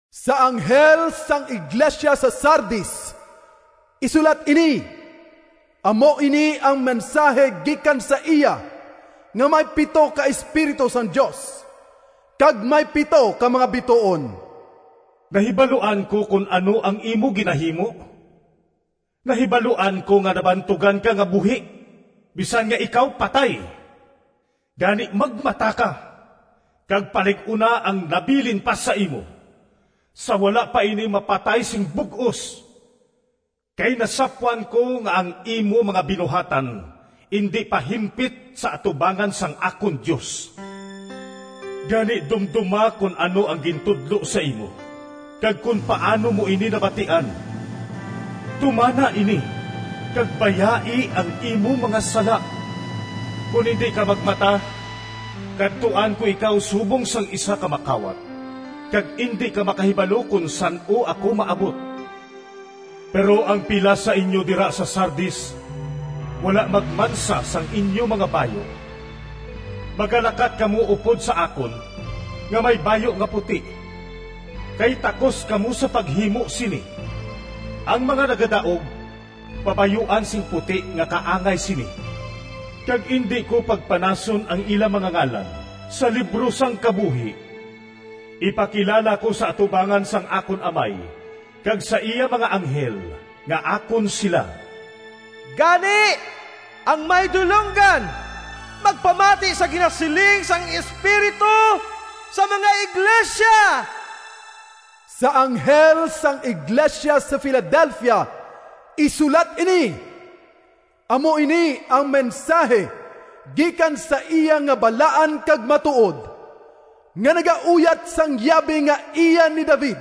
“Sa anghel sang iglesia sa Sardis, isulat ini: “Amo ini ang mensahi gikan sa iya nga may pito ka espiritu sang Dios kag may pito ka mga bituon. Nahibaluan ko kon ano ang imo ginahimo. Nahibaluan ko nga nabantugan ka nga buhi, bisan nga ikaw patay! Gani, magmata ka, kag palig-una ang nabilin pa sa imo, sa wala pa ini mapatay sing bug-os. Kay nasapwan ko nga ang imo mga binuhatan indi pa himpit sa atubangan sang akon Dios. Gani, dumdoma kon ano ang gintudlo sa imo kag kon paano mo ini nabatian. Tumana ini, kag bayai ang imo mga sala. Kon indi ka magmata, kadtuan ko ikaw subong sang isa ka makawat, kag indi ka makahibalo kon san-o ako maabot. Pero ang pila sa inyo dira sa Sardis wala magmansa sang inyo nga mga bayu. Magalakat kamo upod sa akon, nga may bayu nga puti, kay takos kamo sa paghimo sini. Ang mga nagadaog pabayuan sing puti nga kaangay sini kag indi ko pagpanason ang ila mga ngalan sa libro sang kabuhi. Ipakilala ko sa atubangan sang akon Amay kag sa iya mga anghel nga akon sila. “Gani, ang may dulonggan, magpamati sa ginasiling sang Espiritu sa mga iglesia!” “Sa anghel sang iglesia sa Filadelfia, isulat ini: “Amo ini ang mensahi gikan sa iya nga balaan kag matuod, nga nagauyat sang yabi nga iya ni David,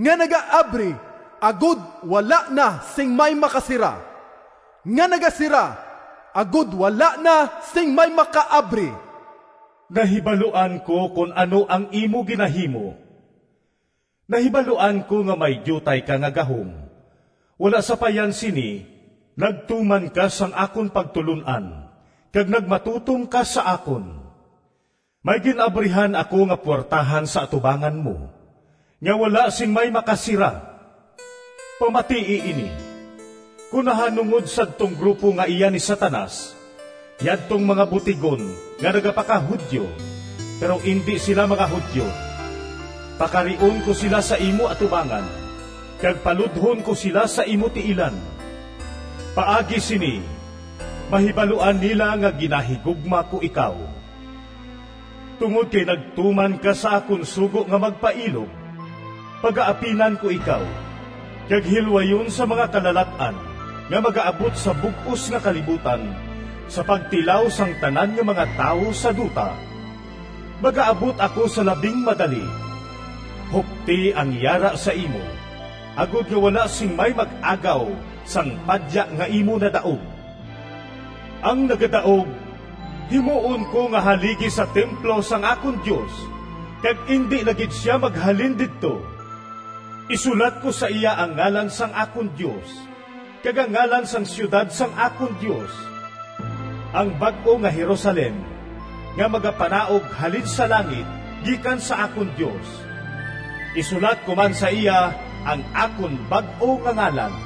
nga nagaabri agod wala na sing may makasira, nga nagasira agod wala na sing may makaabri. Nahibaluan ko kon ano ang imo ginahimo. Nahibaluan ko nga may diutay ka nga gahom, wala sapayan sini nagtuman ka sang akon pagtulon-an kag nagmatutom ka sa akon. May gin-abrihan ako nga puwertahan sa atubangan mo, nga wala sing may makasira. Pamatii ini! Kon nahanungod sadtong grupo nga iya ni Satanas, yadtong mga butigon nga nagapaka-Judio, pero indi sila mga Judio, pakarion ko sila sa imo atubangan kag paludhon ko sila sa imo tiilan. Paagi sini mahibaluan nila nga ginahigugma ko ikaw. Tungod kay nagtuman ka sa akon sugo nga magpailob, pagaapinan ko ikaw kag hilwayon sa mga kalalat-an nga magaabot sa bug-os nga kalibutan sa pagtilaw sang tanan nga mga tawo sa duta. Magaabot ako sa labing madali. Hupti ang yara sa imo agod nga wala sing may mag-agaw sang padya nga imo nadaog. Ang nagadaog himuon ko nga haligi sa templo sang akon Dios, kag indi na gid sia maghalin didto. Isulat ko sa iya ang ngalan sang akon Dios, kag ang ngalan sang siyudad sang akon Dios, ang bag-o nga Jerusalem nga magapanaog halin sa langit gikan sa akon Dios. Isulat ko man sa iya ang akon bag-o nga ngalan.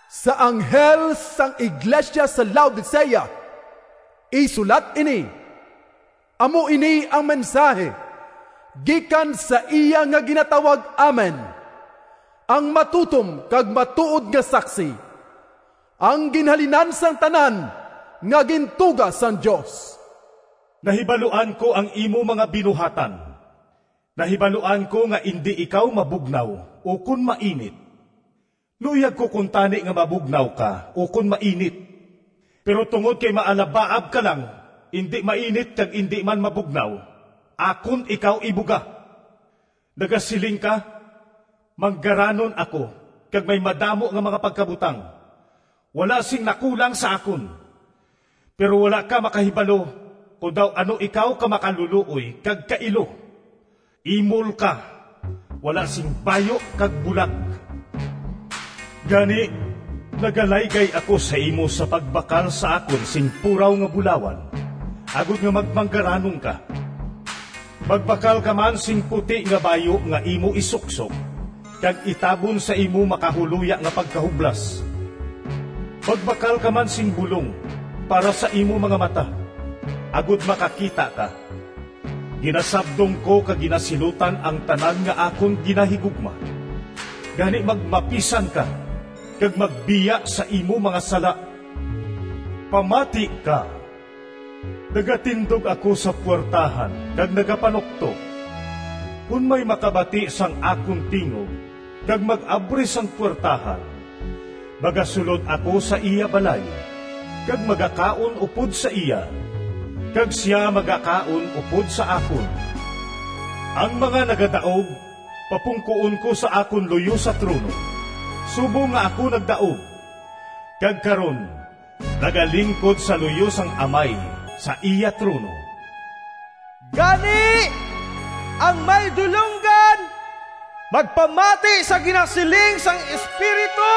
“Sa anghel sang iglesia sa Laodicea, isulat ini: “Amo ini ang mensahi gikan sa iya nga ginatawag Amen, ang matutom kag matuod nga saksi, ang ginhalinan sang tanan nga gintuga sang Dios. Nahibaluan ko ang imo mga binuhatan. Nahibaluan ko nga indi ikaw mabugnaw ukon mainit. Luyag ko kuntani nga mabugnaw ka ukon mainit! Pero tungod kay maalabaab ka lang, indi mainit kag indi man mabugnaw, akon ikaw ibuga! Nagasiling ka, ‘Manggaranon ako kag may madamo nga mga pagkabutang. Wala sing nakulang sa akon.’ Pero wala ka makahibalo kon daw ano ikaw ka makalulooy kag kailo! Imol ka, wala sing bayu kag bulag. Gani, nagalaygay ako sa imo sa pagbakal sa akon sing puraw nga bulawan agod nga magmanggaranon ka. Magbakal ka man sing puti nga bayu nga imo isuksok kag itabon sa imo makahuloya nga pagkahublas. Magbakal ka man sing bulong para sa imo mga mata, agod makakita ka. Ginasabdong ko kag ginasilutan ang tanan nga akon ginahigugma. Gani, magmapisan ka, kag magbiya sa imo mga sala. Pamati ka! Nagatindog ako sa puwertahan kag nagapanuktok. Kon may makabati sang akon tingog kag mag-abri sang puwertahan, magasulod ako sa iya balay, kag magakaon upod sa iya, kag sia magakaon upod sa akon. Ang mga nagadaog papungkoon ko sa akon luyo sa trono, subong nga ako nagdaog, kag karon nagalingkod sa luyo sang Amay sa iya trono. “Gani, ang may dulonggan, magpamati sa ginasiling sang Espiritu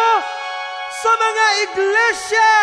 sa mga iglesia!”